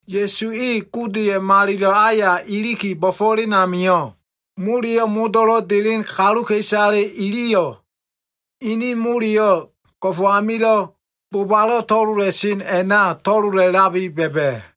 Ya꞉su e Godeya꞉ malilo꞉ aya iliki bo꞉fo꞉len amio꞉, moleyo꞉ modo꞉lo꞉ delen kaluka꞉isale iliyo꞉ ini moleyo꞉ go꞉fo꞉ amilo꞉ bobalo꞉ to꞉lola꞉len a꞉na to꞉lola꞉labi ba꞉ba꞉.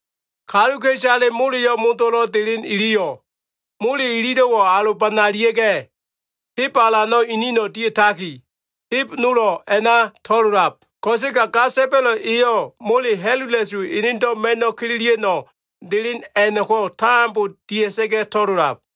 Kaluka꞉isale moleyo꞉ modo꞉lo꞉ delen iliyo꞉, mole ililo꞉wo꞉ alobanalia꞉ga꞉, heb alano꞉ inino꞉ dia꞉taki, heb nolo꞉ a꞉na to꞉lolab. Ko꞉sega ga sa꞉ba꞉lo꞉ eyo꞉, mole ha꞉lula꞉su enedo꞉ ma꞉no꞉ kililia꞉no꞉ delen a꞉no꞉ko꞉ tambo dia꞉sa꞉ga꞉ to꞉lolab.”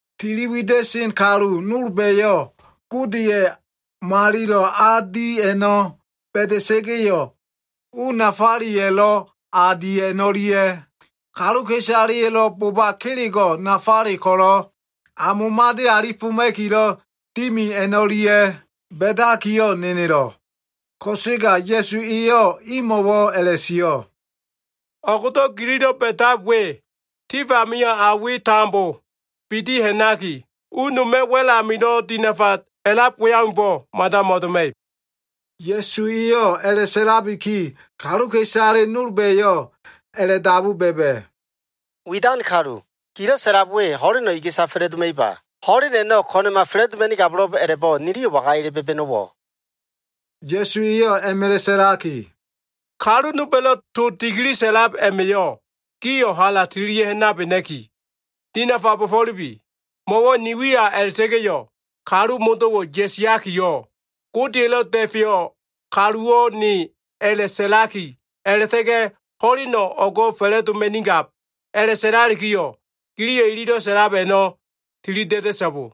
Tiliwida꞉sen kalu nolba꞉yo꞉ Godeya꞉ malilo꞉ a di a꞉no꞉ ba꞉da꞉sa꞉ga꞉yo꞉, u nafaleya꞉lo꞉ a di a꞉no꞉lia꞉, kaluka꞉isaleya꞉lo꞉ boba kelego꞉ nafale ko꞉lo꞉ a momade alifelema꞉kilo꞉ dimi a꞉no꞉lia꞉ ba꞉dakiyo꞉ nenelo꞉. Ko꞉sega Ya꞉su eyo꞉ imo꞉wo꞉ a꞉la꞉sio꞉, “O꞉go꞉do꞉ gililo꞉ ba꞉dab we, tif amio꞉ a we tambo bidi ha꞉naki, u noma꞉ wa꞉l amilo꞉ dinafa a꞉lab we aumbo꞉ mada mo꞉doma꞉ib.” Ya꞉su eyo꞉ a꞉la꞉sa꞉labiki, kaluka꞉isale nolba꞉yo꞉ a꞉la꞉dabu ba꞉ba꞉, “Widan kalu, gilo꞉ sa꞉lab we ho꞉leno꞉ iga꞉sa fa꞉la꞉doma꞉iba? Ho꞉len a꞉no꞉ ko꞉na꞉ma fa꞉la꞉doma꞉nigabo꞉lo꞉b a꞉la꞉bo꞉, niliyo꞉ waga ele ba꞉ba꞉no꞉wo꞉?” Ya꞉su eyo꞉ a꞉ma꞉la꞉ sa꞉laki, “Kalu nolba꞉lo꞉ to dikili sa꞉lab a꞉ma꞉yo꞉ gio꞉ hala tililia꞉ ha꞉nabena꞉ki, dinafa bo꞉fo꞉lubi. Mo꞉wo꞉ ni wiya a꞉la꞉ta꞉ga꞉yo꞉, kalu modo꞉wo꞉ ya꞉siakiyo꞉ ‘Godeya꞉lo꞉ Da꞉feyo꞉ kaluwo꞉ ne’ a꞉la꞉sa꞉laki, a꞉la꞉ta꞉ga꞉ ‘Ho꞉leno꞉ o꞉go꞉ fa꞉la꞉doma꞉nigab’ a꞉la꞉sa꞉lalikiyo꞉, giliyo꞉ ililo꞉ sa꞉lab a꞉no꞉ tilida꞉da꞉so꞉bo.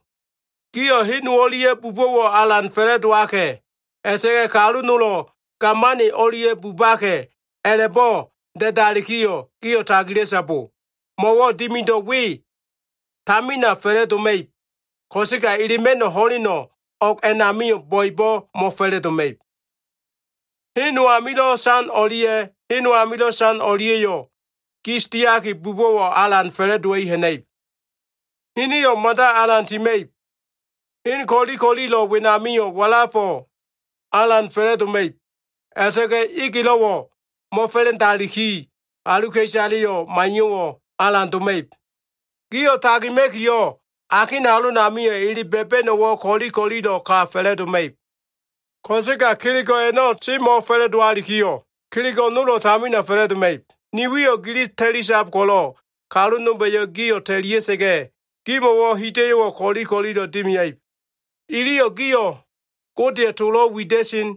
Gio꞉ ‘hen no o꞉lia꞉ bubo꞉wo꞉ alan fa꞉la꞉dowaka꞉’ a꞉la꞉ta꞉ga꞉ ‘kalu nolo꞉ gamani o꞉lia꞉ bubaka꞉’ a꞉la꞉bo꞉ da꞉dalikiyo꞉, gio꞉ tagila꞉so꞉bo! Mo꞉wo꞉ dimido꞉ we tamina fa꞉la꞉doma꞉ib, ko꞉sega elema꞉no꞉ ho꞉leno꞉ o꞉g a꞉namio꞉ bo꞉ebo꞉ mo꞉fa꞉la꞉doma꞉ib. “Hen no amilo꞉ san o꞉lia꞉, hen no amilo꞉ san o꞉lia꞉yo꞉ gis diaki bubo꞉wo꞉ alan fa꞉la꞉dowa꞉i ha꞉na꞉ib. Hiniyo꞉ mada alan tima꞉ib. Hen ko꞉li ko꞉lilo꞉ wenamio꞉ walafo꞉ alan fa꞉la꞉doma꞉ib a꞉la꞉ta꞉ga꞉ egelo꞉wo꞉ mo꞉fa꞉la꞉ndaliki, kaluka꞉isaleyo꞉ maiyo꞉wo꞉ alan doma꞉ib. Gio꞉ tagima꞉kiyo꞉, akin halonamio꞉ ele ba꞉ba꞉no꞉wo꞉ ko꞉li ko꞉lilo꞉ ka fa꞉la꞉doma꞉ib. “Ko꞉sega kelego꞉ a꞉no꞉ semo꞉ fa꞉la꞉dowalikiyo꞉, kelego꞉ nolo꞉ tamina fa꞉la꞉doma꞉ib. Ni wiyo꞉ gili ta꞉lisab ko꞉lo꞉, kalu nolba꞉yo꞉ gio꞉ ta꞉lia꞉sa꞉ga꞉, gimo꞉wo꞉ hida꞉yo꞉wo꞉ ko꞉li ko꞉lilo꞉ dimia꞉ib. Iliyo꞉ gio꞉ Godeya꞉ tolo꞉ wida꞉sen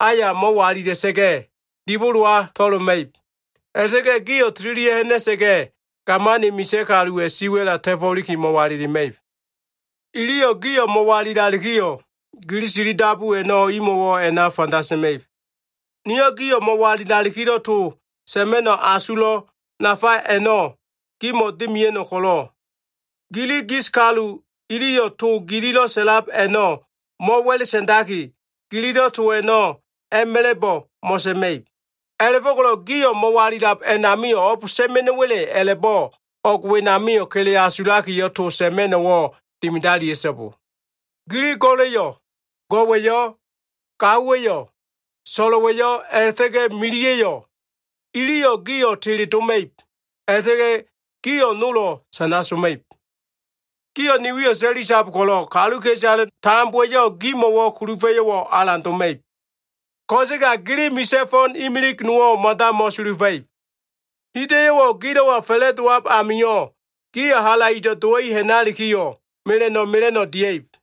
aya mo꞉walila꞉sa꞉ga꞉, dibolowa to꞉loma꞉ib. A꞉la꞉ta꞉ga꞉ gio꞉ tililia꞉ ha꞉na꞉sa꞉ga꞉, gamani misa꞉ kaluwa꞉ siwa꞉la ta꞉fo꞉liki mo꞉walilima꞉ib. Iliyo꞉ gio꞉ mo꞉walilalikiyo꞉, gili tilidabu a꞉no꞉ imo꞉wo꞉ a꞉na fanda sa꞉ma꞉ib. Niyo꞉ gio꞉ mo꞉walilalikilo꞉ to sa꞉ma꞉no꞉ asulo꞉ nafale a꞉no꞉ gimo꞉ dimia꞉no꞉ ko꞉lo꞉, gili gis kalu iliyo꞉ to gililo꞉ sa꞉lab a꞉no꞉ mo꞉wa꞉la꞉ sa꞉ndaki, gililo꞉ to a꞉no꞉ a꞉ma꞉la꞉bo꞉ mo꞉sa꞉ma꞉ib. A꞉la꞉fo꞉ko꞉lo꞉ gio꞉ mo꞉walilab a꞉namio꞉ o꞉b sa꞉ma꞉no꞉wa꞉le a꞉la꞉bo꞉ o꞉g wenamio꞉ kele asulakiyo꞉ to sa꞉ma꞉no꞉wo꞉ dimidalia꞉so꞉bo. Gili go꞉la꞉yo꞉, go꞉wa꞉yo꞉, gaowa꞉yo꞉, so꞉lo꞉wa꞉yo꞉, a꞉la꞉ta꞉ga꞉ miliya꞉yo꞉ iliyo꞉ gio꞉ teledoma꞉ib. A꞉la꞉ta꞉ga꞉ gio꞉ nolo꞉ sana soma꞉ib. Gio꞉ ni wiyo꞉ ta꞉lisab ko꞉lo꞉, kaluka꞉isale tambowa꞉yo꞉ gimo꞉wo꞉ kulufa꞉yo꞉wo꞉ alan doma꞉ib. Ko꞉sega gili misa꞉ fo꞉n imilig nowo꞉ mada mo꞉sulufa꞉ib. Hida꞉yo꞉wo꞉ gilo꞉wa fa꞉la꞉dowab amio꞉, gio꞉ halaido꞉ dowa꞉i ha꞉nalikiyo꞉ mela꞉no꞉ mela꞉no꞉ dia꞉ib.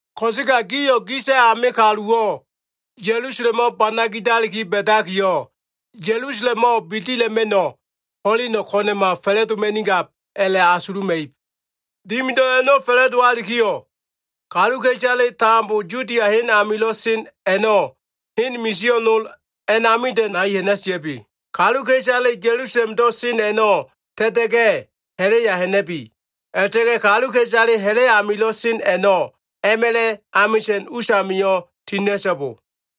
“Ko꞉sega gio꞉ gisa꞉ ame kaluwa꞉yo꞉ Ya꞉lusalemo꞉ bana gidabiki ba꞉dakiyo꞉, Ya꞉lusalemo꞉ bidila꞉ma꞉no꞉ ho꞉leno꞉ ko꞉na꞉ma fa꞉la꞉doma꞉nigab a꞉la꞉asuluma꞉ib. Dimidab a꞉no꞉ fa꞉la꞉dowalikiyo꞉, kaluka꞉isaleyo꞉ tambo Yudia hen amilo꞉ sen a꞉no꞉ hen misio꞉ nol a꞉namida꞉ nai ha꞉na꞉sia꞉bi. Kaluka꞉isale Ya꞉lusalemdo꞉ sen a꞉no꞉ ta꞉ta꞉ga꞉ ha꞉la꞉ya ha꞉na꞉bi. A꞉la꞉ta꞉ga꞉ kaluka꞉isale ha꞉la꞉ amilo꞉ sen a꞉no꞉ a꞉ma꞉la꞉ amisa꞉n usamio꞉ tina꞉so꞉bo.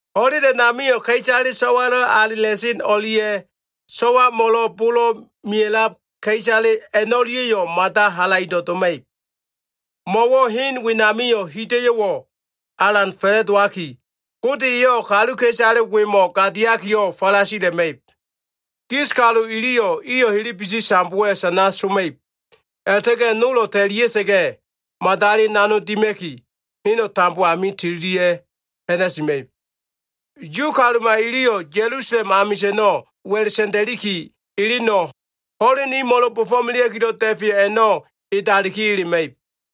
Ho꞉len a꞉namio꞉ ka꞉isale so꞉walo꞉ alela꞉sen o꞉lia꞉, so꞉wamo꞉lo꞉ bolo꞉ mea꞉lab ka꞉isale a꞉no꞉lia꞉yo꞉, mada halaido꞉ doma꞉ib. Mo꞉wo꞉ hen wenamio꞉ hida꞉yo꞉wo꞉ alan fa꞉la꞉dowaki, Gode eyo꞉ kaluka꞉isale wemo꞉ gadiakiyo꞉ falasila꞉ma꞉ib. Gis kalu iliyo꞉ iyo꞉ helebesi sambowa꞉ sana soma꞉ib. A꞉la꞉ta꞉ga꞉ nolo꞉ ta꞉lia꞉sa꞉ga꞉ madali nanog dima꞉ki, heno꞉ tambo ami tililia꞉ ha꞉na꞉sima꞉ib. Yu kaluma iliyo꞉ Ya꞉lusalem amisa꞉no꞉ wa꞉la꞉ sa꞉nda꞉liki eleno꞉, ho꞉len imo꞉lo꞉ bo꞉fo꞉melea꞉kilo꞉ da꞉feyo꞉ a꞉no꞉ edaliki elema꞉ib.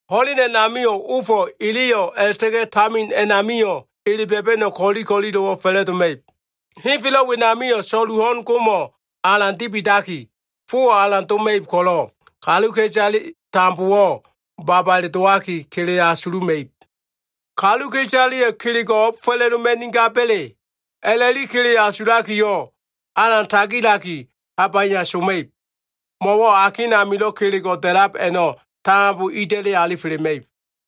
“Ho꞉len a꞉namio꞉ ofo꞉, eleyo꞉, a꞉la꞉ta꞉ga꞉ tamino꞉ a꞉namio꞉ ele ba꞉ba꞉no꞉ ko꞉li ko꞉lilo꞉wo꞉ fa꞉la꞉doma꞉ib. Henfelo꞉ wenamio꞉ so꞉lu ho꞉n gomo꞉ alan dibidaki, fowo꞉ alan doma꞉ib ko꞉lo꞉, kaluka꞉isale tambowo꞉ babale dowaki kele asuluma꞉ib. Kaluka꞉isaleyo꞉ kelego꞉ o꞉b fa꞉la꞉doma꞉nigaba꞉le a꞉la꞉li kele asulakiyo꞉, alan tagilaki habaya soma꞉ib. Mo꞉wo꞉ akin amilo꞉ kelego꞉ da꞉lab a꞉no꞉ tambo ida꞉li alifelema꞉ib.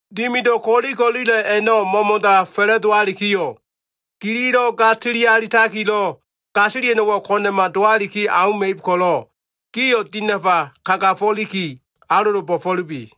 Dimido꞉ ko꞉li ko꞉lilo꞉ a꞉no꞉ mo꞉mo꞉da fa꞉la꞉dowalikiyo꞉, gililo꞉ ga꞉li sili alitakilo꞉ gasilia꞉no꞉wo꞉ ko꞉na꞉ma dowaliki auma꞉ib ko꞉lo꞉, gio꞉ dinafa kagafo꞉liki alolo bo꞉fo꞉lubi.”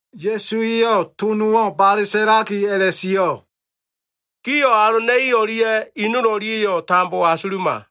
Ya꞉su eyo꞉ to nowo꞉ bale sa꞉laki a꞉la꞉sio꞉, “Gio꞉ alona꞉i o꞉lia꞉ i nol o꞉lia꞉ a꞉no꞉ tambo asuluma.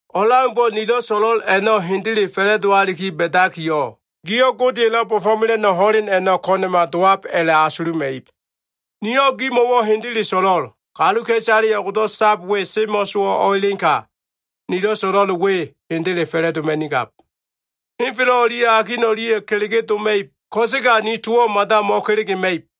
O꞉leaumbo꞉ nilo꞉ so꞉lo꞉l a꞉no꞉ hendele fa꞉la꞉dowaliki ba꞉dakiyo꞉, gio꞉ Godeya꞉lo꞉ bo꞉fo꞉mela꞉no꞉ ho꞉len a꞉no꞉ ko꞉na꞉ma dowab a꞉la꞉asuluma꞉ib. Niyo꞉ gimo꞉wo꞉ hendele so꞉lo꞉l. Kaluka꞉isale o꞉gdo꞉ sab we semo꞉sowo꞉ o꞉elenka, nilo꞉ so꞉lo꞉l we hendele fa꞉la꞉doma꞉nigab. Henfelo꞉ o꞉lia꞉ akin o꞉lia꞉yo꞉ kelege doma꞉ib, ko꞉sega ni towo꞉ mada mo꞉kelegema꞉ib.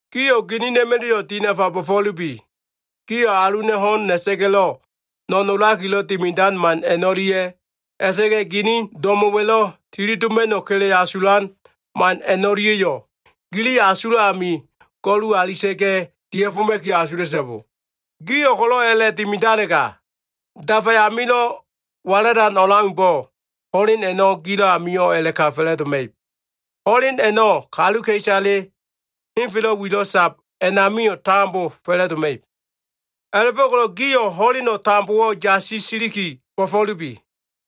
“Gio꞉ ginina꞉ma꞉la꞉yo꞉ dinafa bo꞉fo꞉lubi. Gio꞉ aluna꞉ ho꞉n na꞉sa꞉ga꞉lo꞉ no꞉nolakilo꞉ dimidan man a꞉no꞉lia꞉, a꞉la꞉ta꞉ga꞉ gili do꞉mo꞉wa꞉lo꞉ tili doma꞉no꞉ kele asulan man a꞉no꞉lia꞉yo꞉, gili asulo꞉ amio꞉ go꞉lulia꞉sa꞉ga꞉ dia꞉foma꞉kiyo꞉ asula꞉so꞉bo. Gio꞉ ko꞉lo꞉ a꞉la꞉dimidalega, dafa amilo꞉ walalan o꞉leaumbo꞉, ho꞉len a꞉no꞉ gilo꞉ amio꞉ a꞉la꞉ka fa꞉la꞉doma꞉ib. Ho꞉len a꞉no꞉ kaluka꞉isale henfelo꞉ wilo꞉ sab a꞉namio꞉ tambo fa꞉la꞉doma꞉ib. A꞉la꞉fo꞉ko꞉lo꞉ gio꞉ ho꞉leno꞉ tambowo꞉ yasi siliki bo꞉fo꞉lubi.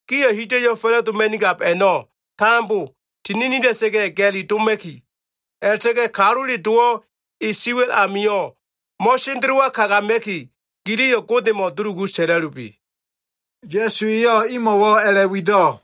Gio꞉ hida꞉yo꞉ fa꞉la꞉doma꞉nigab a꞉no꞉ tambo tininila꞉sa꞉ga꞉ ga꞉li doma꞉ki, a꞉la꞉ta꞉ga꞉ Kalule Dowo꞉ e siwa꞉l amio꞉ mo꞉sendelowa kagama꞉ki, giliyo꞉ Godemo꞉ dulugu sa꞉la꞉lubi.” Ya꞉su eyo꞉ imo꞉wo꞉ a꞉la꞉wido꞉.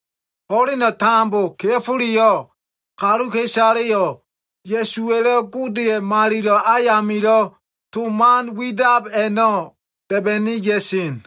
Ho꞉leno꞉ tambo kea꞉foleyo꞉ kaluka꞉isaleyo꞉ Ya꞉suwa꞉lo꞉ Godeya꞉ malilo꞉ ayamilo꞉ to man widab a꞉no꞉ da꞉ba꞉ni ya꞉sen.